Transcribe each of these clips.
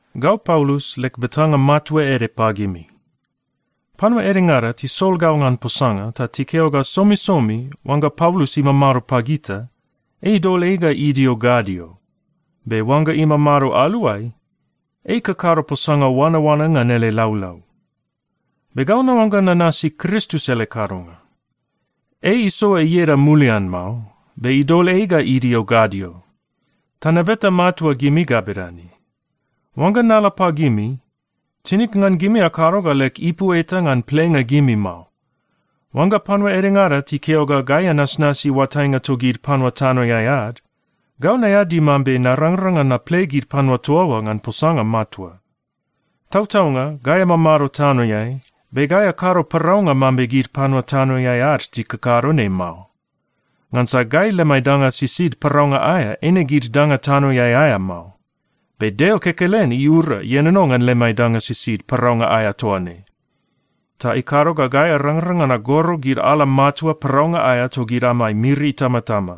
Gau Paulus leg betanga matua ede pagimi. Panua edengada tisol gau ngan posanga ta tikeo ga, “Somisomi oangga Paulus imamado pagita, ei idol ei ga idio gadio, be oangga imamado aluai, ei ikakado posanga oanaoana ngan ele laulau.” Be gau naoangga nanasi Kristus ele kadonga. Ei isoa ieda mulian mao, be idol ei ga idio gadio. Ta nabeta matua gimi ga bedane: Oangga nala pagimi, tinig ngan gimi akado ga leg ipu eta ngan plenga gimi mao. Oangga panua edengada tikeo ga gai anasnasi oatainga togid panua tanoeai ad, gau naeadi mambe narangrang ngan naple gid panua toa oa ngan posanga matua. Tautaunga gai amamado tanoeai, be gai akado paraunga mambe gid panua tanoeai ad tikakado ne mao. Ngansa gai lemai danga sisid paraunga aea eine gid danga tanoeai aea mao. Be Deo kekelen iura ienono ngan lemai danga sisid paraunga aea toa ne, ta ikado ga gai arangrang ngan agoro gid ala matua paraunga aea togid amai miri itamatama.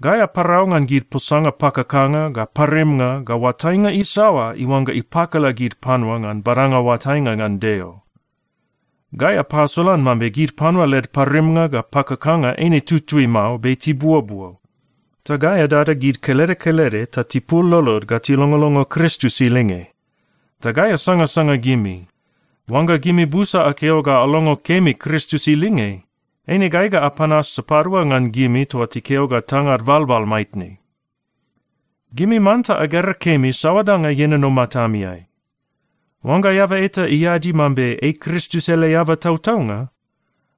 Gai aparau ngan gid posanga pakakanga ga parimnga ga oatainga isaoa iuangga ipakala gid panua ngan badanga oatainga ngan Deo. Gai apasolan mambe gid panua led parimnga ga pakakanga eine tutui mao, be tibuobuo. Ta gai adada gid kelede kelede ta tipul lolod ga tilongolongo Kristus ilinge. Ta gai asangasanga gimi. Oangga gimi busa akeo ga alongo kemi Kristus ilinge, eine gai ga apanas sapadua ngan gimi toa tikeo ga tangad balbal maitne. Gimi manta agera kemi saoa danga ienono matamiai. Oangga eaba eta iadi mambe ei Kristus ele eaba tautaunga,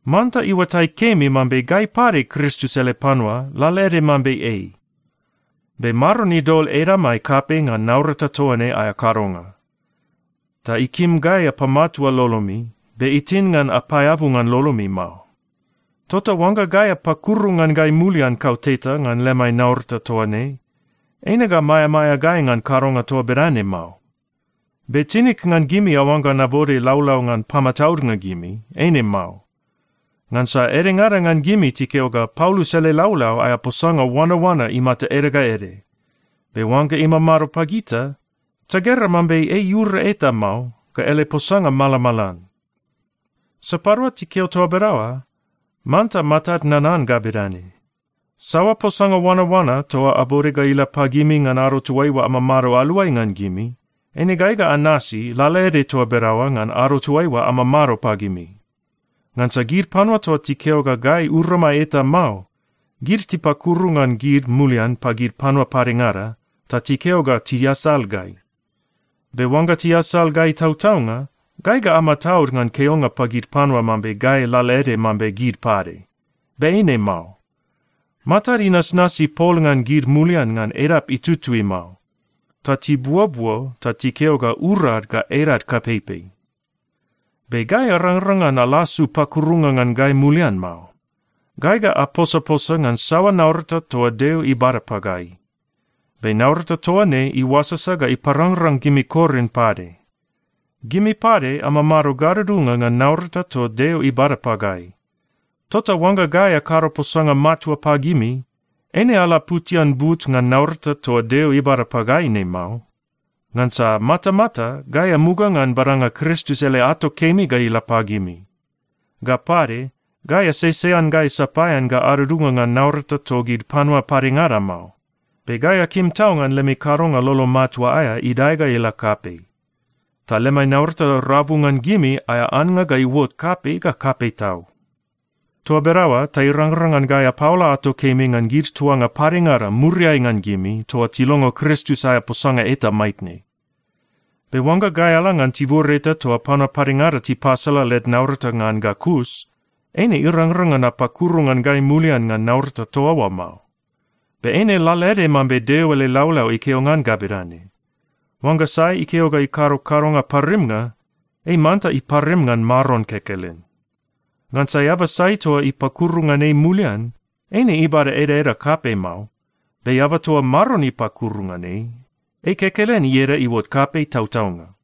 manta iuatai kemi mambe gai pade Kristus ele panua lalaede mambe ei. Be Maron idol edamai kapei ngan naurata toa ne aea kadonga. Ta ikim gai apamatua lolomi, be itin ngan apaeabu ngan lolomi mao. Tota oangga gai apakuru ngan gai mulian kauteta ngan lemai naurata toa ne, eine ga maeamaea gai ngan kadonga toa bedane mao. Be tinig ngan gimi aoangga nabode laulau ngan pamataudnga gimi. Eine mao. Ngansa edengada ngan gimi tikeo ga, “Paulus ele laulau aea posanga oanaoana imata ede ga ede, be oangga imamado pagita, tagera mambe ei iura eta mao, ga ele posanga malamalan.” Sapadua tikeo toa bedaoa, manta matad nanan ga bedane: Saoa posanga oanaoana toa abode ga ila pagimi ngan ado toaiua amamado aluai ngan gimi, eine gai ga anasi lalaede toa bedaoa ngan ado toaiua amamado pagimi. Ngansa gid panua toa tikeo ga gai uramai eta mao, gid tipakuru ngan gid mulian pagid panua padengada ta tikeo ga tiasal gai. Be oangga tiasal gai tautaunga, gai ga amataud ngan keonga pagid panua mambe gai lalaede mambe gid pade. Be eine mao. Matad inasnasi pol ngan gid mulian ngan edap itutui mao, ta tibuobuo ta tikeo ga urad ga edad kapeipei. Be gai arangrang ngan alasu pakurunga ngan gai mulian mao. Gai ga aposaposa ngan saoa naurata toa Deo ibada pagai. Be naurata toa ne iuasasa ga iparangrang gimi Korin pade. Gimi pade amamado gadudunga ngan naurata toa Deo ibada pagai. Tota oangga gai akado posanga matua pagimi, eine alaputian but ngan naurata toa Deo ibada pagai ne mao. Ngansa matamata gai amuga ngan badanga Kristus ele ato kemi ga ila pagimi. Ga pade, gai asesean gai sapaean ga adudunga ngan naurata togid panua padengada mao. Be gai akim tau ngan lemi kadonga lolo matua aea idae ga ila kapei, ta lemai naurata rabu ngan gimi aea annga ga iuot kapei ga kapei tau. Toa bedaoa ta irangrang ngan gai apaola ato kemi ngan gid tuanga padengada muriai ngan gimi toa tilongo Kristus aea posanga eta maitne. Be oangga gai ala ngan tibur eta toa panua padengada tipasala led naurata ngan ga kus, eine irangrang ngan apakuru ngan gai mulian ngan naurata toa oa mao. Be eine lalaede mambe Deo ele laulau ikeo ngan ga bedane, “Oangga sai ikeo ga ikado kadonga parimnga, ei manta iparim ngan Maron kekelen.” Ngansa eaba sai toa ipakuru ngan ei mulian, eine ibada edaeda kapei mao. Be eaba toa Maron ipakuru ngan ei, ei kekelen ieda iuot kapei tautaunga.